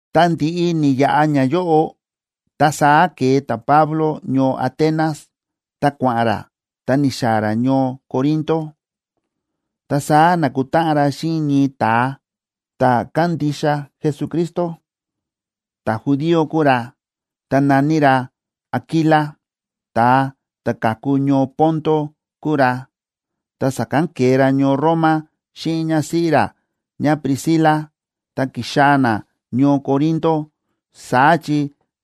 Ta ndi̱ꞌi ni̱yaꞌa ñayóꞌo, ta saá ke̱e ta̱Pablo ñoo Atenas, ta kua̱ꞌa̱n ra ta ni̱xaa̱ ra ñoo Corinto. Ta saá na̱kutáꞌan ra xíꞌin ñii ta̱a ta̱ kándixa Jesucristo, ta̱judío kúu ra, ta na̱ní ra Aquila. Ta̱a ta̱ ka̱ku ñoo Ponto kúu ra, ta sa̱kán ke̱e ra ñoo Roma xíꞌin ñásíꞌí ra ñáPriscila ta ki̱xaa̱ na ñoo Corinto. Saá chi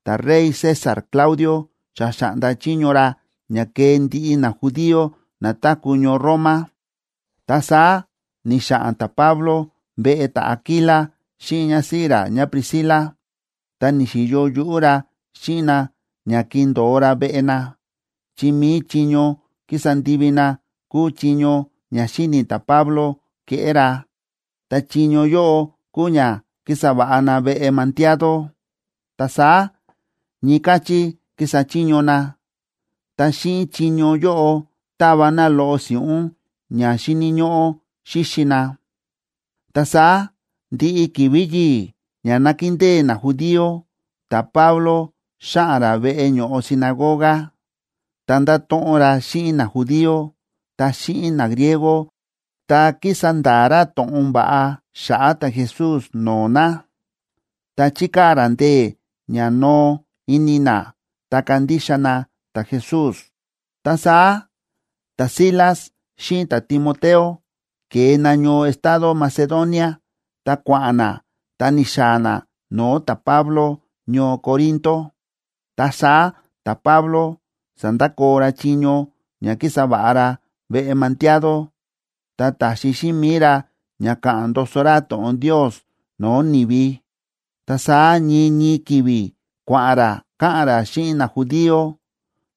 ta̱rey César Claudio xa xa̱ꞌnda chiño ra ña kee ndiꞌi najudío na táku̱ ñoo Roma. Ta saá ni̱xa̱ꞌa̱n ta̱Pablo veꞌe ta̱Aquila xíꞌin ñásíꞌí ra ñáPriscila, ta ni̱xi̱yo yuꞌú ra xíꞌin na ña ki̱ndo̱o ra veꞌe na, chi mi̱i chiño kísa ndivi na kúu chiño ña xíni̱ ta̱Pablo keꞌé ra. Ta chiño yóꞌo kúu ña kísa va̱ꞌa na veꞌe mandiado. Ta saá ñii káchí kísa chiño na, ta xíꞌin chiño yóꞌo táva na loꞌo si̱ꞌún ña xíni̱ ñóꞌó xíxi na. Ta saá ndiꞌi ki̱vi̱ yi̱i̱ ña nákindée najudío, ta̱Pablo xáꞌa̱n ra veꞌe ño̱ꞌo sinagoga, ta ndáto̱ꞌon ra xíꞌin najudío ta xíꞌin nagriego, ta kísa nda̱a̱ ra to̱ꞌon va̱ꞌa xa̱ꞌa̱ ta̱Jesús no̱o̱ na, ta chíkaa̱ ra ndee̱ ña noo ini na, ta kandixa na ta̱Jesús. Ta saá ta̱Silas xíꞌin ta̱Timoteo ke̱e na ñoo estado Macedonia ta kua̱ꞌa̱n na ta ni̱xaa̱ na no̱o̱ ta̱Pablo ñoo Corinto. Ta saá ta̱Pablo sa̱ndakoo ra chiño ña kísa va̱ꞌa ra veꞌe mandiado, ta ta̱xi xíꞌin mi̱i ra ña káꞌa̱n ndoso ra to̱ꞌon Ndios no̱o̱ ni̱vi. Ta saá ñii ñii ki̱vi̱ kua̱ꞌa̱n ra káꞌa̱n ra xíꞌin najudío,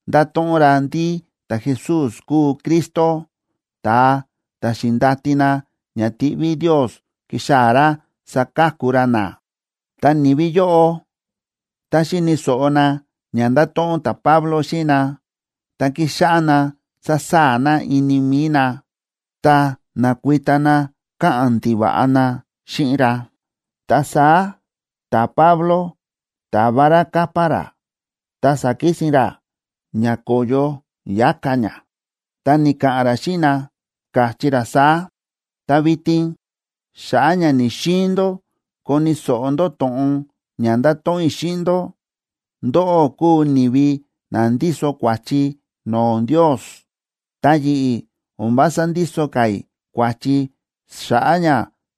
ndáto̱ꞌon ra ndí ta̱Jesús kúu Cristo, ta̱a ta̱ xi̱ndati na ña tiꞌví Ndios kixaa̱ ra saka̱ku ra na. Ta ni̱vi yóꞌo, tá xi̱ni̱ so̱ꞌo na ña nda̱to̱ꞌon ta̱Pablo xíꞌin na, ta ki̱xáꞌá na sásaa̱ na ini mi̱i na, ta na̱kuita na káꞌa̱n ndiva̱ꞌa na xíꞌin ra. Ta saá ta̱Pablo ta̱va ra capa ra, ta sa̱kisin ra ña ko̱yo yáka ña, ta ni̱ka̱ꞌa̱n ra xíꞌin na, káchí ra saá: ―Ta vitin, xa̱ꞌa̱ ña ni̱‑xiin ndó koni̱ so̱ꞌo ndó to̱ꞌon ña nda̱to̱ꞌon i̱ xíꞌin ndó, ndóꞌó kúu ni̱vi na ndíso kua̱chi no̱o̱ Ndios. Ta yi̱ꞌi̱ o̱n vása ndíso ka̱ i̱ kua̱chi xa̱ꞌa̱ ña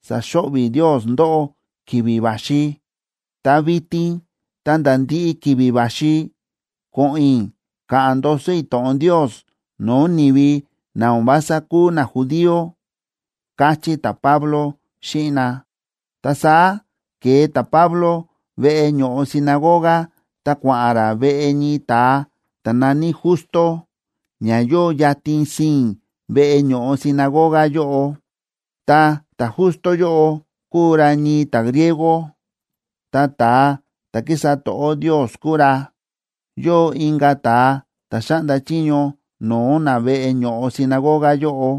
saxo̱ꞌvi̱ Ndios ndóꞌó ki̱vi̱ va̱xi. Ta vitin ta̱nda̱ ndiꞌi ki̱vi̱ va̱xi, ko̱ꞌo̱n i̱ ka̱ꞌa̱n ndoso i̱ to̱ꞌon Ndios no̱o̱ ni̱vi na o̱n vása kúu najudío ―káchí ta̱Pablo xíꞌin na. Ta saá ke̱e ta̱Pablo veꞌe ño̱ꞌo sinagoga ta kua̱ꞌa̱n ra veꞌe ñii ta̱a ta̱ na̱ní Justo, ña yóo yatin sii̱n veꞌe ño̱ꞌo sinagoga yóꞌo. Ta ta̱Justo yóꞌo kúu ra ñii ta̱griego, ta ta̱a ta̱ kísa to̱ꞌó Ndios kúu ra. Yóo inka̱ ta̱a ta̱ xáꞌnda chiño no̱o̱ na veꞌe ño̱ꞌo sinagoga yóꞌo,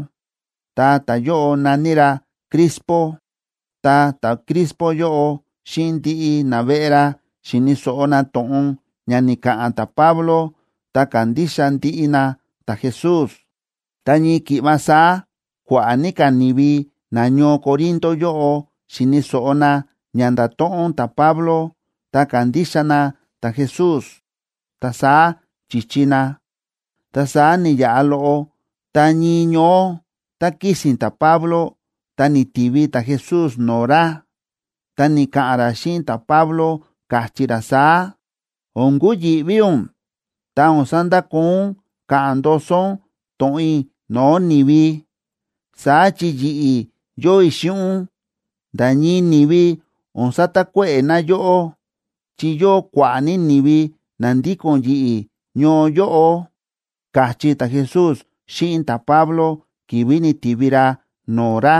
ta ta̱yóꞌo na̱ní ra Crispo. Ta ta̱Crispo yóꞌo xíꞌin ndiꞌi naveꞌe ra xi̱ni̱ so̱ꞌo na to̱ꞌon ña ni̱ka̱ꞌa̱n ta̱Pablo ta ka̱ndixa ndiꞌi na ta̱Jesús. Ta ñii ki̱ꞌva saá kua̱ꞌa̱ ní ka̱ ni̱vi nañoo Corinto yóꞌo xi̱ni̱ so̱ꞌo na ña nda̱to̱ꞌon ta̱Pablo, ta ka̱ndixa na ta̱Jesús, ta saá chi̱chi na. Ta saá ni̱yaꞌa loꞌo, ta ñii ñoó tá kísi̱n ta̱Pablo, ta ni̱tivi ta̱Jesús no̱o̱ ra, ta ni̱ka̱ꞌa̱n ra xíꞌin ta̱Pablo, káchí ra saá: ―O̱n kuyi̱ꞌví ún, ta o̱n sandakoo ún káꞌa̱n ndoso ún to̱ꞌon i̱ no̱o̱ ni̱vi. Saá chi yi̱ꞌi̱ yóo i̱ xíꞌin ún. Nda̱ ñii ni̱vi o̱n satakuéꞌe̱ na yóꞌó, chi yóo kua̱ꞌa̱ ní ni̱vi na ndíko̱n yi̱ꞌi̱ ñoo yóꞌo ―káchí ta̱Jesús xíꞌin ta̱Pablo ki̱vi̱ ni̱ti̱vi ra no̱o̱ ra.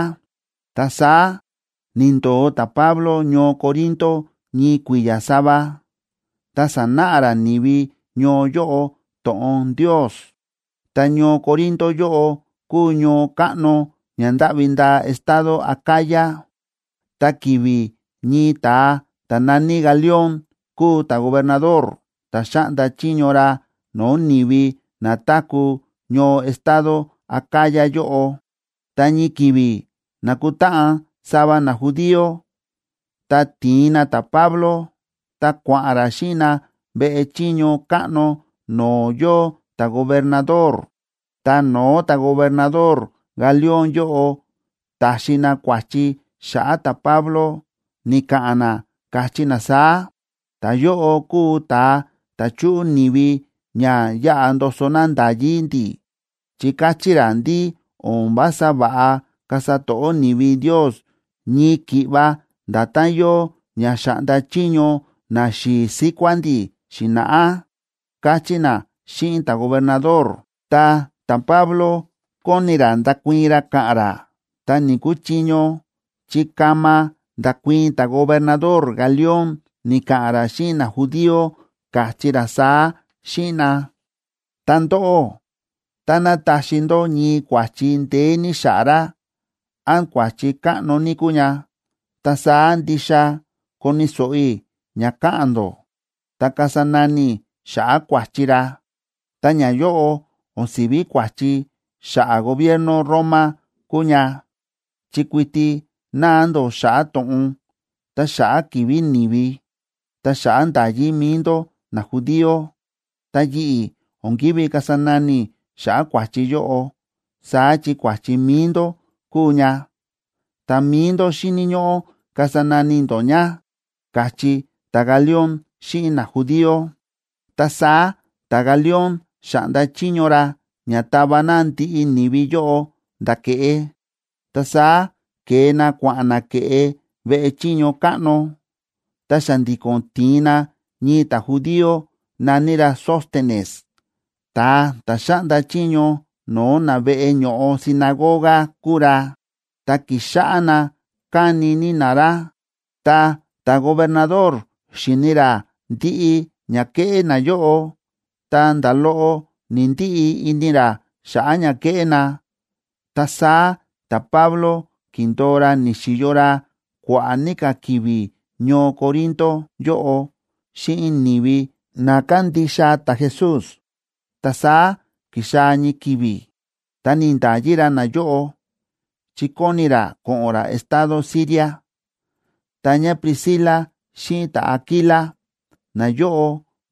Ta saá ni̱ndo̱o ta̱Pablo ñoo Corinto ñii kui̱ya̱ sava, ta sánáꞌa ra ni̱vi ñoo yóꞌo to̱ꞌon Ndios. Ta ñoo Corinto yóꞌo kúu ñoo káꞌno ña ndáꞌvi ndaa estado Acaya. Ta ki̱vi̱ ñii ta̱a ta̱ na̱ní Galión kúu ta̱gobernador ta xáꞌnda chiño ra no̱o̱ ni̱vi na táku̱ ñoo estado Acaya yóꞌo, ta ñii ki̱vi̱ na̱kutáꞌan sava najudío, ta ti̱in na ta̱Pablo, ta kua̱ꞌa̱n ra xíꞌin na veꞌe chiño káꞌno no̱o̱ yóo ta̱gobernador. Ta no̱o̱ ta̱gobernador Galión yóꞌo, ta̱xi na kua̱chi xa̱ꞌa̱ ta̱Pablo, ni̱ka̱ꞌa̱n na, káchí na saá: ―Ta̱yóꞌo kúu ta̱a ta̱ chúꞌu ni̱vi ña yaꞌa ndoso na nda̱yí ndi̱, chi káchí ra ndí o̱n vása va̱ꞌa kasa to̱ꞌó ni̱vi Ndios ñii ki̱ꞌva nda̱tán yóo ña xa̱ꞌnda chiño naxi̱i̱ síkuá ndi̱ xi̱na̱ꞌá ―káchí na xíꞌin ta̱gobernador. Ta ta̱Pablo kóni ra ndakuii̱n ra ka̱ꞌa̱n ra, ta ni̱‑kuchiño, chi kama nda̱kuii̱n ta̱gobernador Galión, ni̱ka̱ꞌa̱n ra xíꞌin najudío, káchí ra saá xíꞌin na: ―Ta ndóꞌó, táná taxi ndó ñii kua̱chi ndeé ní xa̱ꞌa̱ ra, án kua̱chi káꞌno ní kúu ña, ta saá ndixa koni̱ so̱ꞌo i̱ ña ka̱ꞌa̱n ndó, ta kasa nani i̱ xa̱ꞌa̱ kua̱chi ra. Ta ñayóꞌo o̱n si̱ví kua̱chi xa̱ꞌa̱ gobierno Roma kúu ña, chi kuiti náa ndó xa̱ꞌa̱ to̱ꞌon, ta xa̱ꞌa̱ ki̱vi̱ ni̱vi, ta xa̱ꞌa̱ nda̱yí mi̱i ndó najudío. Ta yi̱ꞌi̱ o̱n ki̱ví kasa nani i̱ xa̱ꞌa̱ kua̱chi yóꞌo, saá chi kua̱chi mi̱i ndó kúu ña, ta mi̱i ndó xíni̱ ñóꞌó kasa nani ndó ña ―káchí ta̱Galión xíꞌin najudío. Ta saá ta̱Galión xa̱ꞌnda chiño ra ña tava na ndiꞌi ni̱vi yóꞌo nda̱ ke̱ꞌe. Ta saá ke̱e na kua̱ꞌa̱n na ke̱ꞌe veꞌe chiño káꞌno, ta xa̱ndi̱ko̱n ti̱in na ñii ta̱judío na̱ní ra Sóstenes, ta̱a ta̱ xáꞌnda chiño no̱o̱ na veꞌe ño̱ꞌo sinagoga kúu ra, ta ki̱xáꞌá na káni ní na ra. Ta ta̱gobernador xi̱ni ra ndiꞌi ña kéꞌé nayóꞌo, ta nda̱ loꞌo ni̱‑ndiꞌi ini ra xa̱ꞌa̱ ña kéꞌé na. Ta saá ta̱Pablo ki̱ndo̱o ra, ni̱xi̱yo ra kua̱ꞌa̱ ní ka̱ ki̱vi̱ ñoo Corinto yóꞌo xíꞌin ni̱vi na kándixa ta̱Jesús. Ta saá ki̱xaa̱ ñii ki̱vi̱, ta ni̱nda̱yi ra nayóꞌo, chi kóni ra ko̱ꞌo̱n ra estado Siria. Ta ñáPriscila xíꞌin ta̱Aquila, nayóꞌo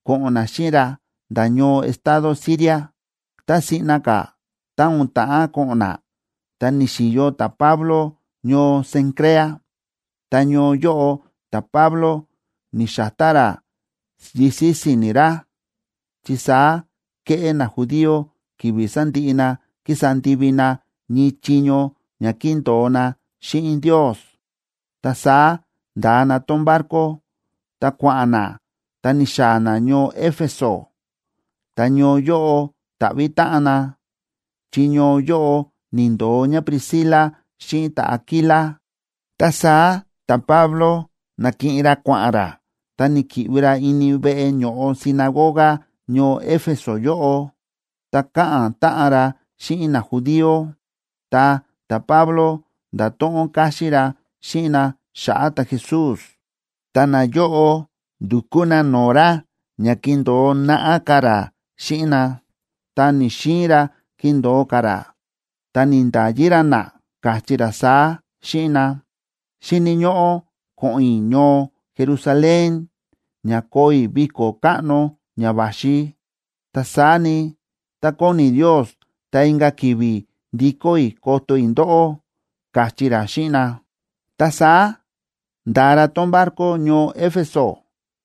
ko̱ꞌo̱n na xíꞌin ra nda̱ ñoo estado Siria. Ta siꞌna ka̱, tá o̱n ta̱ꞌán ko̱ꞌo̱n na, ta ni̱xi̱yo ta̱Pablo ñoo Cencrea, ta ñoo yóꞌo ta̱Pablo ni̱xa̱tá ra yisi̱ si̱ni̱ ra, chi saá kéꞌé najudío ki̱vi̱ sa̱ndiꞌi na ki̱sa ndivi na ñii chiño ña ki̱ndo̱o na xíꞌin Ndios. Ta saá nda̱a na tón barco, ta kua̱ꞌa̱n na ta ni̱xaa̱ na ñoo Éfeso, ta ñoo yóꞌo ni̱ta̱ꞌvi̱ táꞌan na, chi ñoo yóꞌo ni̱ndo̱o ñáPriscila xíꞌin ta̱Aquila. Ta saá ta̱Pablo na̱kiꞌin ra kua̱ꞌa̱n ra ta ni̱ki̱ꞌvi ra ini veꞌe ño̱ꞌo sinagoga ñoo Éfeso yóꞌo, ta káꞌa̱n táꞌan ra xíꞌin najudío. Ta ta̱Pablo nda̱to̱ꞌon káxín ra xíꞌin na xa̱ꞌa̱ ta̱Jesús. Ta nayóꞌo ndu̱kú na no̱o̱ ra ña kindo̱o naꞌá ka̱ ra xíꞌin na, ta ni̱‑xiin ra kindo̱o ka̱ ra, ta ni̱nda̱yi ra na, káchí ra saá xíꞌin na: ―Xíni̱ ñóꞌó ko̱ꞌo̱n i̱ ñoo Jerusalén ña koo i̱ viko̱ káꞌno ña va̱xi. Ta saá ni, tá kóni Ndios, ta inka̱ ki̱vi̱ ndikó i̱ koto i̱ ndóꞌó ―káchí ra xíꞌin na. Ta saá nda̱a ra tón barco ñoo Éfeso,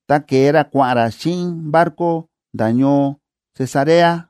ta ke̱e ra kua̱ꞌa̱n ra xíꞌin barco nda̱ ñoo Cesarea.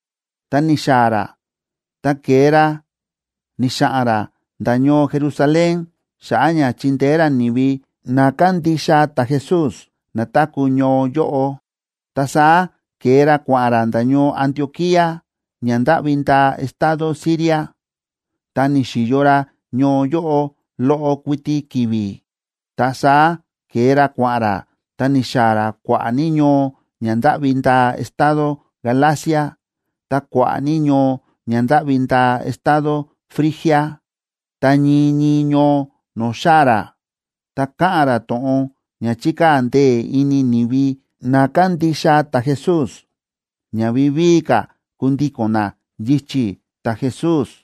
Tá ni̱xaa̱ ra, ta ke̱e ra ni̱xa̱ꞌa̱n ra nda̱ ñoo Jerusalén xa̱ꞌa̱ ña chi̱ndeé ra ni̱vi na kándixa ta̱Jesús na táku̱ ñoo yóꞌo. Ta saá ke̱e ra kua̱ꞌa̱n ra nda̱ ñoo Antioquía, ña ndáꞌvi ndaa estado Siria, ta ni̱xi̱yo ra ñoo yóꞌo loꞌo kuiti ki̱vi̱. Ta saá ke̱e ra kua̱ꞌa̱n ra, ta ni̱xaa̱ ra kua̱ꞌa̱ ní ñoo ña ndáꞌvi ndaa estado Galacia ta kua̱ꞌa̱ ní ñoo ña ndáꞌvi ndaa estado Frigia. Ta ñii ñii ñoo no̱o̱ xáa̱ ra, ta káꞌa̱n ra to̱ꞌon ña chi̱kaa̱ ndee̱ ini ni̱vi na kándixa ta̱Jesús, ña vivíi ka̱ kundíko̱n na yichi̱ ta̱Jesús.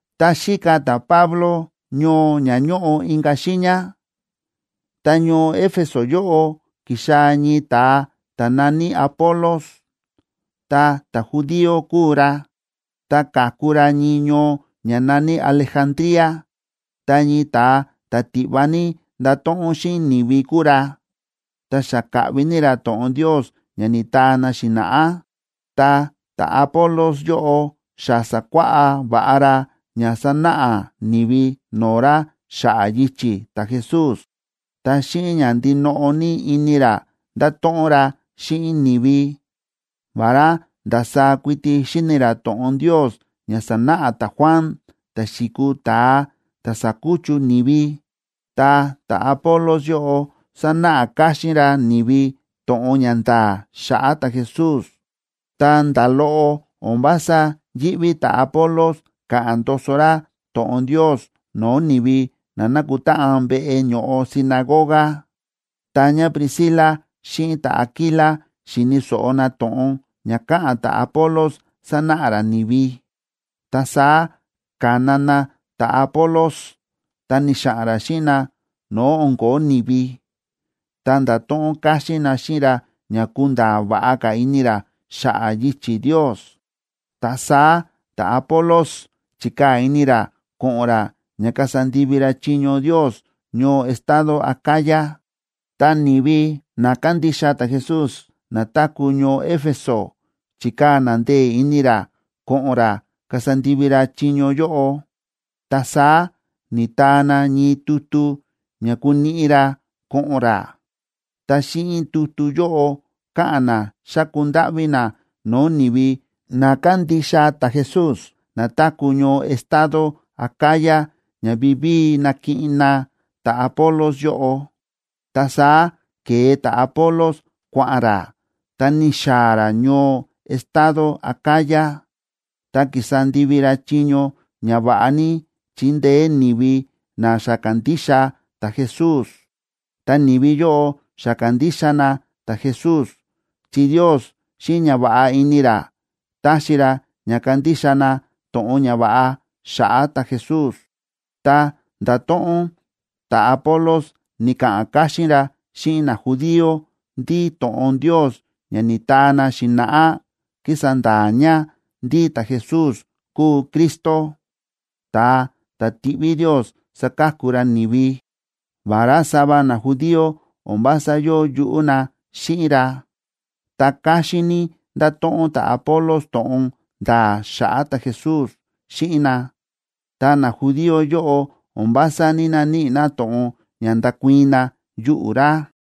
Tá xíka ta̱Pablo ñoo ña ñóꞌo inka̱ xiiña, ta ñoo Éfeso yóꞌo ki̱xaa̱ ñii ta̱a ta̱ na̱ní Apolos, ta ta̱judío kúu ra, ta ka̱ku ra ñii ñoo ña na̱ní Alejandría. Ta ñii ta̱a ta̱ tiꞌva ní ndáto̱ꞌon xíꞌin ni̱vi kúu ra, ta xa káꞌvi ní ra to̱ꞌon Ndios ña ni̱taa na xi̱na̱ꞌá. Ta ta̱Apolos yóꞌo xa sa̱kuáꞌá va̱ꞌa ra ña sa̱náꞌa ni̱vi no̱o̱ ra xa̱ꞌa̱ yichi̱ ta̱Jesús, ta xíꞌin ña ndinoꞌo ní ini ra ndáto̱ꞌon ra xíꞌin ni̱vi. Vará ndasaá kuiti xíni̱ ra to̱ꞌon Ndios ña sa̱náꞌa ta̱Juan ta̱ xi̱kuu ta̱a ta sa̱kuchu ni̱vi, ta ta̱Apolos yóꞌo sa̱náꞌa káxín ra ni̱vi to̱ꞌon ña nda̱a̱ xa̱ꞌa̱ ta̱Jesús. Ta nda̱ loꞌo o̱n vása yíꞌví ta̱Apolos káꞌa̱n ndoso ra to̱ꞌon Ndios no̱o̱ ni̱vi na nákutáꞌan veꞌe ño̱ꞌo sinagoga. Ta ñáPriscila xíꞌin ta̱Aquila xi̱ni̱ so̱ꞌo na to̱ꞌon ña káꞌa̱n ta̱Apolos sánáꞌa ra ni̱vi, ta saá ka̱na na ta̱Apolos, ta ni̱xa̱ꞌa̱n ra xíꞌin na no̱o̱ o̱n ko̱ó ni̱vi, ta nda̱to̱ꞌon káxín na xíꞌin ra ña kunda̱a̱ va̱ꞌa ka̱ ini ra xa̱ꞌa̱ yichi̱ Ndios. Ta saá ta̱Apolos chi̱kaa̱ ini ra ko̱ꞌo̱n ra ña kasa ndivi ra chiño Ndios ñoo estado Acaya, ta ni̱vi na kándixa ta̱Jesús na táku̱ ñoo Éfeso chi̱kaa̱ na ndee̱ ini ra ko̱ꞌo̱n ra kasa ndivi ra chiño yóꞌo. Ta saá ni̱taa na ñii tutu ña kuniꞌi ra ko̱ꞌo̱n ra. Ta xíꞌin tutu yóꞌo káꞌa̱n na xáku ndáꞌví na no̱o̱ ni̱vi na kándixa ta̱Jesús na táku̱ ñoo estado Acaya ña vivíi nakiꞌin na ta̱Apolos yóꞌo. Ta saá ke̱e ta̱Apolos, kua̱ꞌa̱n ra ta ni̱xaa̱ ra ñoo estado Acaya, ta ki̱sa ndivi ra chiño ña va̱ꞌa ní chi̱ndeé ni̱vi na xa ka̱ndixa ta̱Jesús. Ta ni̱vi yóꞌo xa ka̱ndixa na ta̱Jesús, chi Ndios xíꞌin ñava̱ꞌa ini ra ta̱xi ra ña kandixa na to̱ꞌon ñava̱ꞌa xa̱ꞌa̱ ta̱Jesús. Ta nda̱to̱ꞌon ta̱Apolos, ni̱ka̱ꞌa̱n káxín ra xíꞌin najudío ndí to̱ꞌon Ndios ña ni̱taa na xi̱na̱ꞌá kísa nda̱a̱ ña ndí ta̱Jesús kúu Cristo, ta̱a ta̱ ti̱ꞌví Ndios saka̱ku ra ni̱vi. Vará sava najudío o̱n vása yóo yuꞌú na xíꞌin ra, ta káxín ní nda̱to̱ꞌon ta̱Apolos to̱ꞌon nda̱a̱ xa̱ꞌa̱ ta̱Jesús xíꞌin na, ta najudío yóꞌo o̱n vása ní‑naníꞌi na to̱ꞌon ña ndakuii̱n na yuꞌu̱ ra.